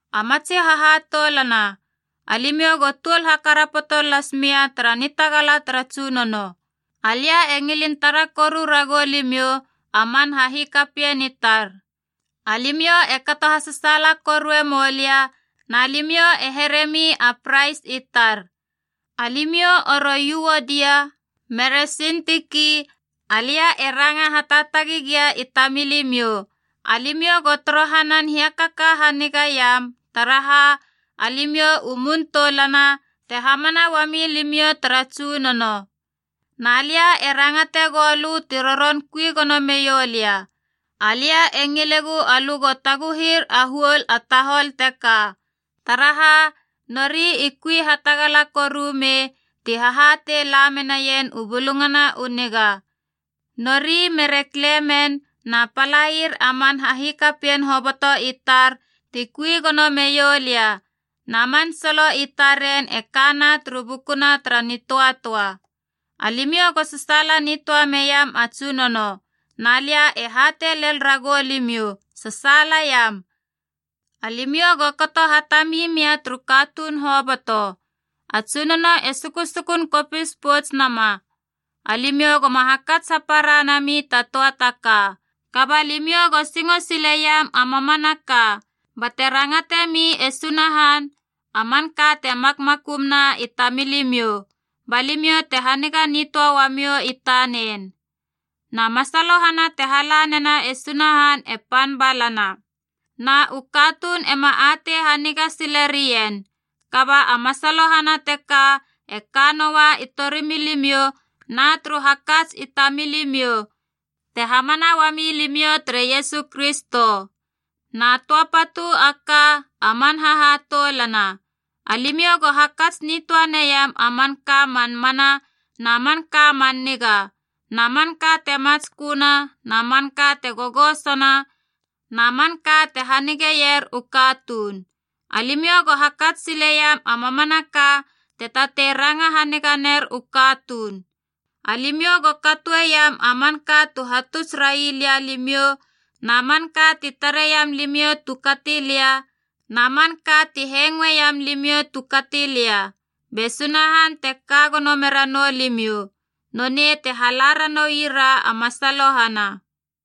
A matsi hahatoulana, alimiou go tuol hakarapoto lasmia tara nitagala tara Tsunono. Alia e ngilin tara koru ragou limiou, a man hahikapien i tar. Alimiou e kato hasasaala korue moulia na limiou e heremi a prais i tar. Alimiou oro Yuodia mere Sintiki, alia e ranga hataatagi gia i tamilimiou, alimiou go torohanan hiakaka hanigaiam, taraha alimiou u mun toulana te hamana uami limiou tara Tsunono. Na lia e rangate goulö ti ron kui gono meiou lia, alia e ngilegu alö go taguhir a huol a tahol teka. Taraha, nori i kui hatagala koru me ti hahatei lamenien u Bulungana u Niga, nori mere Klemen na palair a man hahikapien hoboto i tar ti kui gono meioulia, na man solo i taren e kana turu bukuna tara nitöatöa. Alimiou go sasaala nitöa meiam a Tsunono! Na lia e hatei lel ragou limiou, sasaalaiam! Alimiou go kato hatami mia turu katuun hoboto. A Tsunono e sukusukun kopis poutsnama. Alimiou goma hakats hapara nami ta töa ta ka. Kaba limiou go singo siliam a mamanaka, bate rangatemi e Sunahan a manka te makmakumuna i tamilimiou, ba limiou te haniga nitöa uamiou i tanen. Na masalohana te hala nena e Sunahan e pan balana. Na u katuun ema atei haniga silerien. Kaba a masalohana teka e ka noua i torimilimiou na turu hakats i tamilimiou, te hamana uami limiou tere Iesu Kristo. Na töa patu a ka, a man hahatoulana. Alimiou go hakats nitöa neiam a manka a man mana, na manka a man niga, na manka te matsköna, na manka te gogosona, na manka te hanigeier u katuun. Alimiou go hakats siliam a mamanaka te tatei ranga haniga ner u katuun. Alimiou go katoeiam a manka tu hatuts railia limiou na manka ti tareiam limiou tu kati lia na man ka ti hengoeiam limiou tu kati lia. Be Sunahan te ka gono meranou limiou. Nonei te hala ranoui ra a masalohana.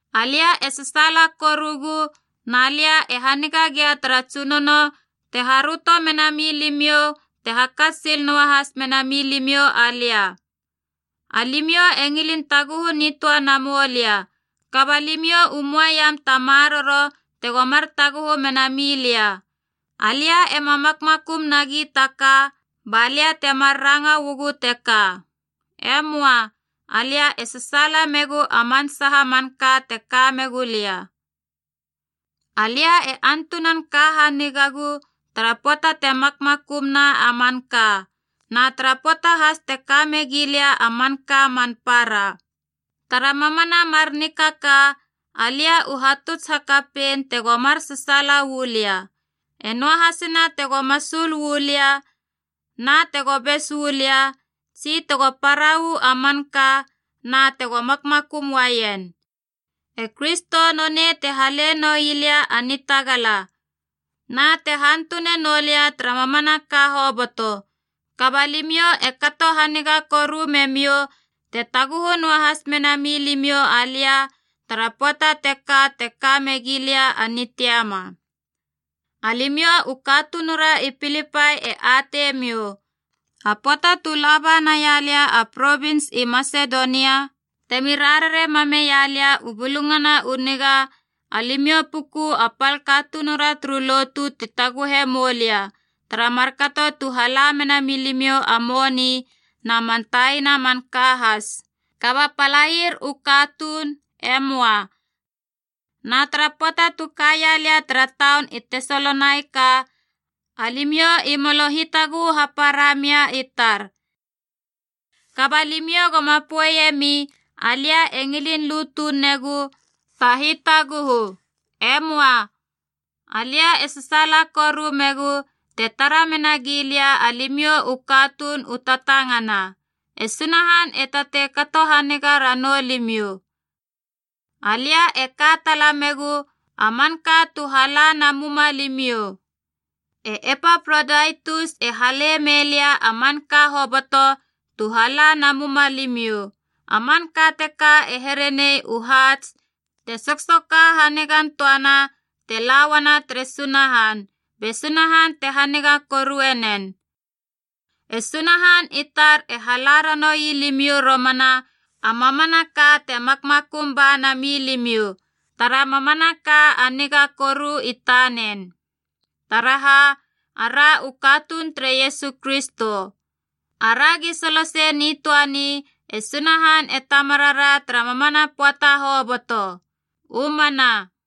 Alia e sasaala korugu na lia e haniga gia tara Tsunono te haröto mena milimiou te hakats sil noahas mena milimiou alia. Alimiou e ngilin taguhu nitöa namou lia, kaba limiou u möaiam ta maroro tego mar taguhu menami lia. Alia ema makmakum nagi ta ka ba lia temar ranga uagu teka. E möa, alia e sasaala megu a man saha manka te ka megu lia. Alia e antunan ka hanigagu tara pöata te makmakum na a manka, na tara pöata has te ka megia lia a manka man para. Tara mamana mar nikaka alia u hatuts hakapein tego mar sasaala uu lia, e noahasina tego masul uu lia na tego bes uu lia, tsi tego para uu a manka na tego makmakum uaien. E Kristo nonei te hale noi lia a nitagala, na te hantune noulia tara mamanaka hoboto. Kaba limiou e kato haniga koru memiou te taguhu noahas mena milimiou alia tara pöata teka te ka megia lia a nitiama. Alimiou u katunura i Pilipai e atei miou, a pöata tu laba naia lia a provins i Masedonia temi rarare mameia lia u Bulungana u Niga, alimiou puku a pal katunura turu lotu tu taguhe moulia tara markato tu hala mena milimiou a moni na man taina manka has. Kaba palair u katuun, e möa. Na tara pöata tu kaia lia tara taun i Tesalonaika, alimiou i molo hitaguhu hapara mia i tar. Kaba limiou goma poeiemi alia e ngilin lu tunegu ta hitaguhu. E möa. Alia e sasaala koru megu te tara menagi lia alimiou u katuun u tatangana. E Sunahan e tatei kato haniga ranou limiou. Alia e ka tala megu a manka tu hala namuma limiou. E Epaprodaitus e halei mei lia a manka hoboto tu hala namuma limiou. A manka teka e herenei u haats te soksoka hanigan töana te la uana tere Sunahan be Sunahan te haniga korue nen. E Sunahan i tar e hala ranoui limiou romana a mamanaka te makmakum ba nami limiou tara mamanaka a niga koru i tanen, taraha ara u katuun tere Iesu Kristo. Aragi solosei nitöani e Sunahan e Tamarara tara mamana pöata hoboto. U mana.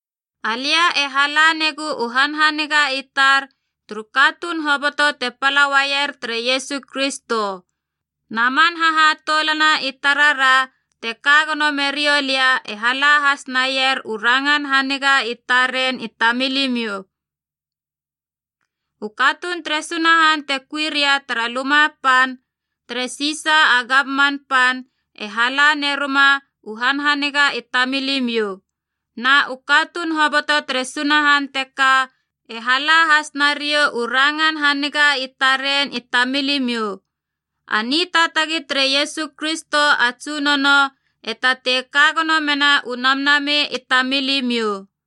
Alia e hala negu u hanhaniga i tar turu katuun hoboto te pala uaier tere Iesu Kristo. Na man hahatoulana i tarara te ka gono meriou lia e hala has naier u rangan haniga i taren i tamilimiou. U katuun tere Sunahan te kui ria tara luma pan tere Sisa a gamman pan e hala neruma u hanhaniga i tamilimiou, na u katuun hoboto tere Sunahan teka e hala has nariou u rangan haniga i taren i tamilimiou. A nitaatagi tere Iesu Kristo a Tsunono e tatei ka gono mena u namnamei i tamilimiou.